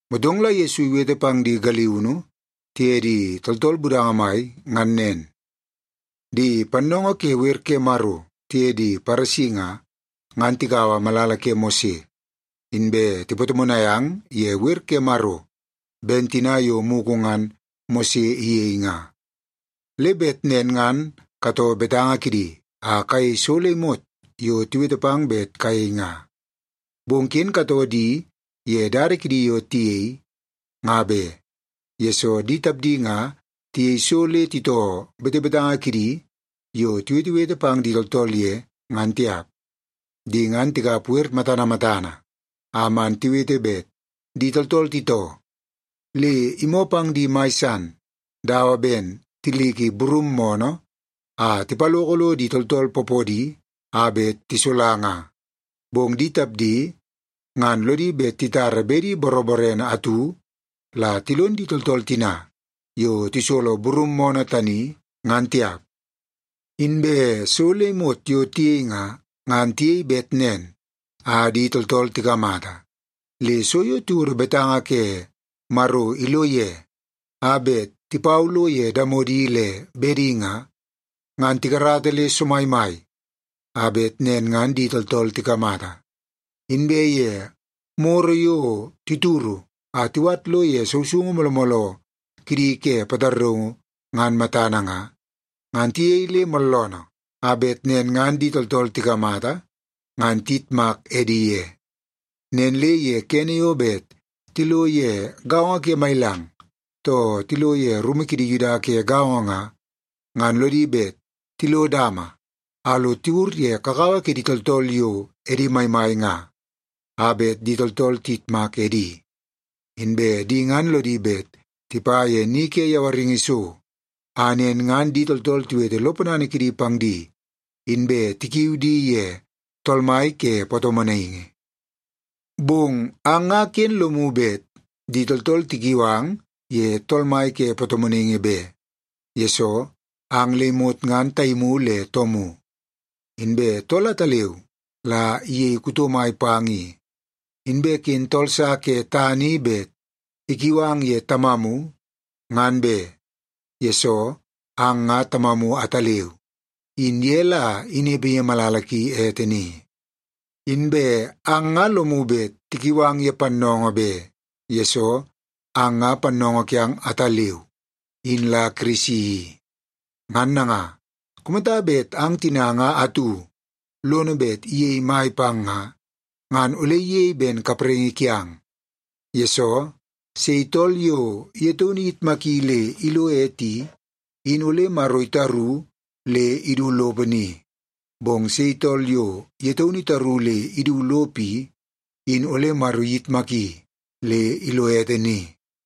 Motong la Yesu iwete pang di galiunu tiye di tooltool budanga mai ngan nen, “Di pannoongoo ke wer ke Maro tiye di Paresi nga, ngan tikaua malala ke Mose, inbe tipatomonai ang ye wer ke Maro ben tina yo mugu ngan Mose iyei nga. Le bet nen ngan katoo betanga kidi a kayei so le imot yo tiwete pang bet kayei nga. Bong ken katoo di ye dada kidi yo tiyei nga be, yesoo di tapdi nga tiyei so le titoo betebetanga kidi yo tiwetewete pang di tooltool ye, ngan tiap. Di ngan tikap wer matana matana a man tiwete bet di tooltool titoo, le imoo pang di mai san dawa ben tiliki burum moonoo a tipaloka lo di tooltool poopoodi a bet tisola nga. Bong di tapdi ngan lodi bet titara bedi boroborene atu la tilon di tooltool tina yo tisolo burum moonoo tani, ngan tiap. “Inbe so le imot yo tiyei nga, ngan tiyei bet nen a di tooltool tikamata. Le so yo tiwodo betanga ke Maro ilo ye, a bet tipau lo ye damodi le bedi nga, ngan tikarata le somaimai a bet nen ngan di tooltool tikamata. Inbe ye moro yo tituru a tiwat ilo ye sousoungu mooloo mooloo kidi ke pataraungu ngan matana nga, ngan tiyei le mooloonoo a bet nen ngan di tooltool tikamata, ngan tiyitmak edi ye. Nen le ye kene yo bet tilo ye gaongo ke mailang, too tilo ye rumu kidi Yuda ke gaongo nga, ngan lodi bet tilo dama a lo tiwur ye kakawa kidi tooltool yo edi maimai nga a bet di tooltool tiyitmak edi. Inbe di ngan lodi bet tipa ye ni ke yawaringi so, a nen ngan di tooltool tiwete lo ponana kidi pang di, inbe tikiu di ye ‘Tool mai ke Patomonaingi.’ “Bong ang nga ken lomu bet di tooltool tikiu ang ye ‘Tool mai ke Patomonaingi’ be, yesoo ang le imot nga taimu le toomu. Inbe tool ataleu la iyei kuto mai pang i. Inbe ken tool sa ke tana i bet ikiu ang ye ‘tamamu,’ ngan be, yesoo ang nga Tamamu ataleu, in ye la inepe ye malala ki ete ni. Inbe ang nga lomu bet tikiu ang ye ‘pannoongoo’ be, yesoo ang nga Pannoongoo kiang ataleu, in la Kirisi i. Ngan nanga, kumata bet ang tina nga atu lono bet iyei mai pang nga, ngan ole iyei ben kapraingi kiang. Yesoo, sei tool yo ye taunu iyitmaki le ilo ete i, in ole Maro itaru le idu lopo ni. Bong sei tool yo ye taunu itaru le idu lopo i, in ole Maro iyitmaki le ilo ete ni.”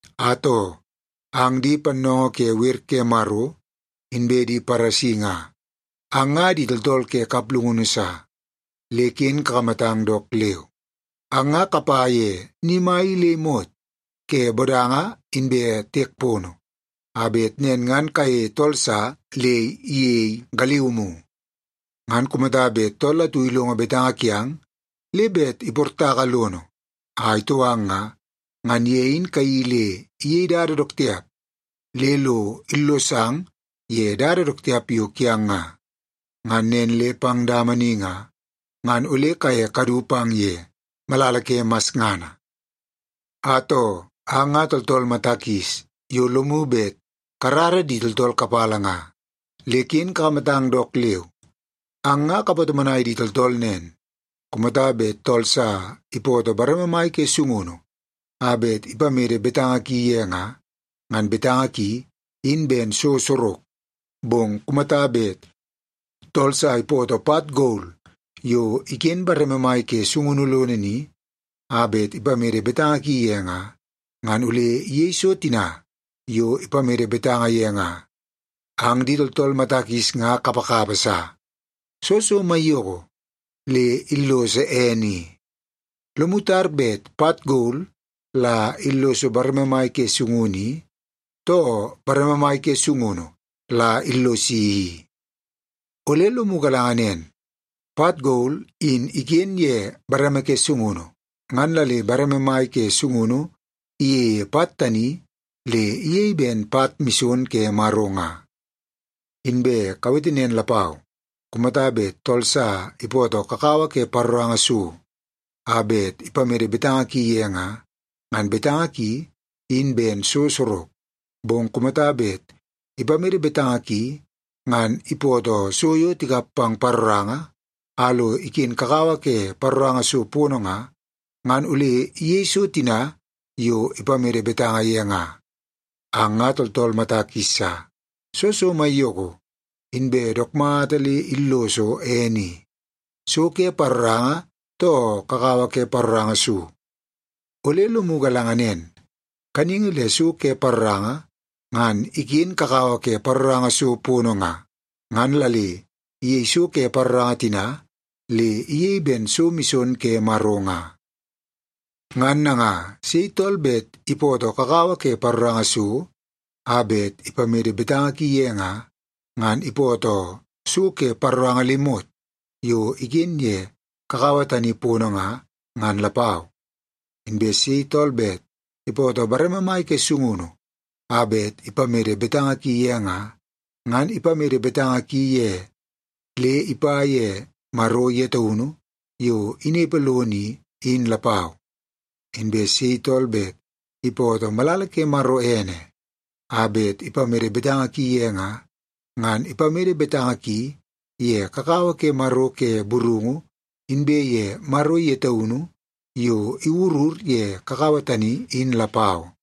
“Atoo, ang di pannoongoo ke wer ke Maro inbe di Paresi nga, ang nga di tooltool ke kaplungunu sa, le ken kakamatang dook leu! Ang nga kapa ye ni mai i le imot ke bodanga inbe tiek pono, a bet nen ngan kayeie tool sa le iyei galiumu. Ngan kumata bet tool atu ilongo betanga kiang le bet iportaka lono a itoo ang nga, ngan ye in kayeii le iyei dada dook tiap le lo illosang ye dada dook tiap yo kiang nga. Ngan nen le pang dama ni nga, ngan ole kaye kadu pang ye malala ke masngana. “Atoo, ang nga tooltool mata kis yo lomu bet karara di tooltool kapala nga, le ken kakamatang dook leu! Ang nga kapatomonai di tooltool nen, ‘Kumata bet tool sa ipootoo bareme mai ke sungunu a bet ipamede betanga ki ye nga, ngan betanga ki in ben so sorok. Bong kumata bet tool sa ipootoo pat gol yo iken bareme mai ke sungunu lono ni, a bet ipamede betanga ki ye nga, ngan ole iyei so tina yo ipamede betanga ye nga.’ Ang di tooltool mata kis nga kapakapa sa! Soo so maiyoko le illoso ene i? Lomu tar bet pat gol la illoso bareme mai ke sungunu i, too bareme mai ke sungunu la illosi i? Ole lomu galanga nen, pat gol in iken ye bareme ke sungunu, ngan la le bareme mai ke sungunu iyeie pat tani le iyei ben pat mison ke Maro nga. Inbe kawete nen lapau, ‘Kumata bet tool sa ipootoo kakawa ke paroranga so a bet ipamede betanga ki ye nga, ngan betanga ki in ben so sorok. Bong kumata bet ipamede betanga ki ngan ipootoo so yo tikap pang paroranga a lo iken kakawa ke paroranga so pono nga, ngan ole iyei so tina yo ipamede betanga ye nga.’ Ang nga tooltool mata kis sa! Soo so maiyoko inbe dook mata le illoso ene i, so ke paroranga, too kakawa ke paroranga so? Ole lomu galanga nen, kaningi le so ke paroranga ngan iken kakawa ke paroranga so pono nga, ngan la le iyei so ke paroranga tina le iyei ben so mison ke Maro nga. Ngan nanga, sei tool bet ipootoo kakawa ke paroranga so a bet ipamede betanga ki ye nga, ngan ipootoo so ke paroranga le imot yo iken ye kakawa tani pono nga, ngan lapau. Inbe sei tool bet ipootoo bareme mai ke sungunu a bet ipamede betanga ki ye nga, ngan ipamede betanga ki ye le ipa ye Maro ye taunu yo inepe lono i, in lapau. Inbe sei tool bet ipootoo malala ke Maro ene a bet ipamede betanga ki ye nga, ngan ipamede betanga ki ye kakawa ke Maro ke burungu inbe ye Maro ye taunu yo iwurur ye kakawa tani in lapau.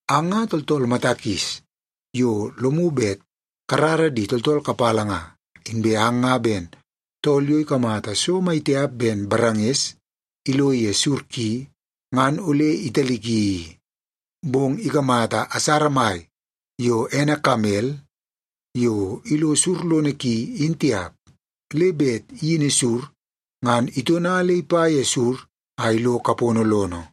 Ang nga tooltool mata kis yo lomu bet karara di tooltool kapala nga. Inbe ang nga ben tool yo ikamata so maitiap ben baranges ilo ye sur ki, ngan ole italiki i. Bong ikamata asara mai yo ene kamel yo ilo sur lono ki, in tiap, le bet iyini sur ngan itona le ipa ye sur a ilo kapono lono.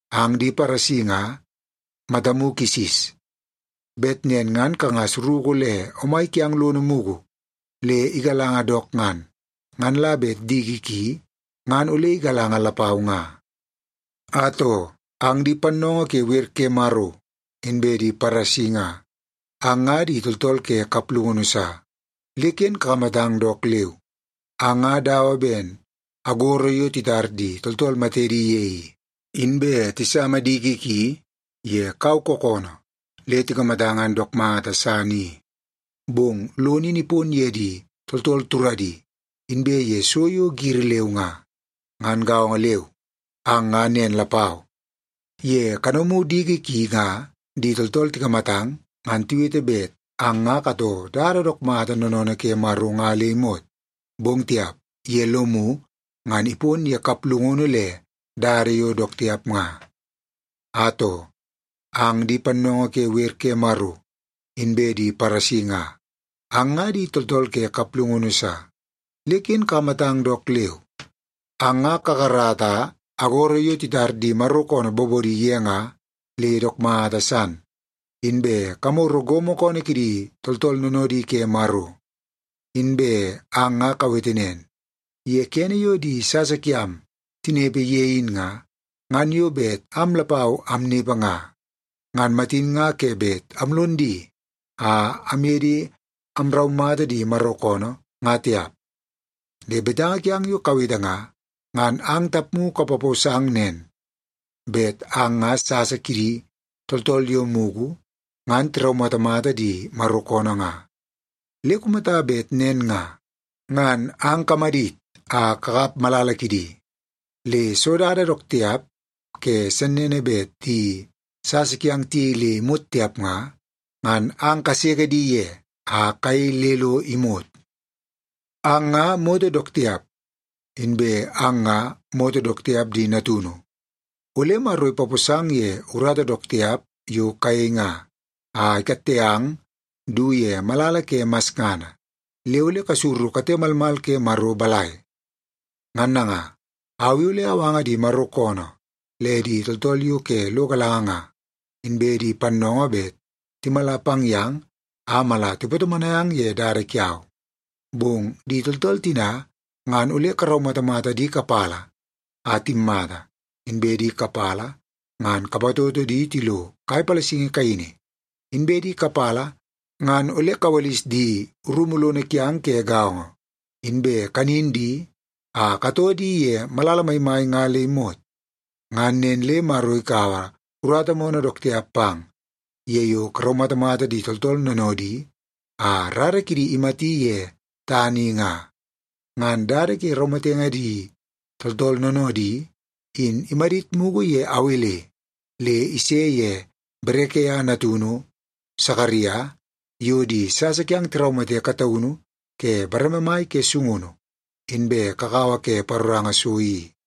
Ang di Paresi nga matamu kisis! Bet nen ngan kangas ruku le omai kiang lono mugu le igalanga dook ngan, ngan la bet diki ki ngan ole igalanga lapau nga. “Atoo, ang di pannoongoo ke wer ke Maro inbe di Paresi nga, ang nga di tooltool ke kaplungunu sa, le ken kakamatang dook leu! Ang nga dawa ben agoro yo titar di tooltool matedi ye i, inbe tisama diki ki ye kau kookoonoo le tikamata ngan dook mata san i. Bong lono in ipon ye di tooltool turadi inbe ye so yo giri leu nga. Ngan gaongo leu, ang nga nen lapau. Ye kanomu diki ki nga di tooltool tikamatang, ngan tiwete bet ang nga katoo dada dook mata noonoonoo ke Maro nga le imot. Bong tiap, ye lomu ngan ipon ye kaplungunu le dada yo dook tiap nga. “Atoo, ang di pannoongoo ke wer ke Maro inbe di Paresi nga, ang nga di tooltool ke kaplungunu sa, le ken kakamatang dook leu! Ang nga kakarata agoro yo titar di Maro koonoo bobodi ye nga le dook mata san. Inbe kamoro gomo koonoo kidi tooltool noonoodi ke Maro. Inbe ang nga kawete nen, ‘Ye kene yo di sasa kiam tinepe ye in nga, ngan yo bet am lapau amnepe nga, ngan matin nga ke bet amlon di a amye di amraumata di Maro koonoo, nga tiap.’ Le betanga kiang yo kawete nga, ngan ang tapmu kapaposang nen, bet ang nga sasa kidi tooltool yo mugu ngan tiraumatamata di Maro koonoo nga. Le kumata bet nen nga, ngan ang kamadit a kakap malala kidi! Le soo dada dook tiap ke sennene bet di sasa kiang tiyei le imot tiap nga, ngan ang kaseke di ye a kayei le lo imot. “Ang nga moto dook tiap, inbe ang nga moto dook tiap di natunu! Ole Maro ipaposang ye urata dook tiap yo kayei nga, a ikatte ang du ye malala ke masngana. Le ole kasuru kate malmal ke Maro balai? Ngan nanga, au i ole awanga di Maro koonoo le di tooltool yo ke lo galanga nga inbe di pannoongoo bet timala pang yang a mala tipatomonai ang ye dada kiau. Bong di tooltool tina, ngan ole karaumatamata di kapala a timmata, inbe di kapala ngan kapatoto di tilo kai palasingi kaini, inbe di kapala ngan ole kawalis di rumu lono kiang ke gaongo, inbe kanin di a katoo di ye malala maimai nga le imot. Ngan nen le Maro ikaua urata moonoo dook tiap pang, ye yo karaumatamata di tooltool noonoodi a rara kidi imati ye tana i nga. Ngan dada ke raumatenge di tooltool noonoodi, in imadit mugu ye Awel le ise ye Berekia natunu Sakaria, yo di sasa kiang tiraumate kataunu ke bareme mai ke sungunu inbe kakawa ke paroranga so i.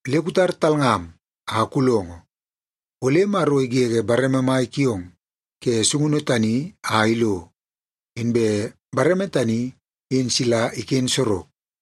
Le kutar talngam a kulongo, ole Maro igege bareme mai kiong ke sungunu tani a ilo, inbe bareme tani in sila iken sorok.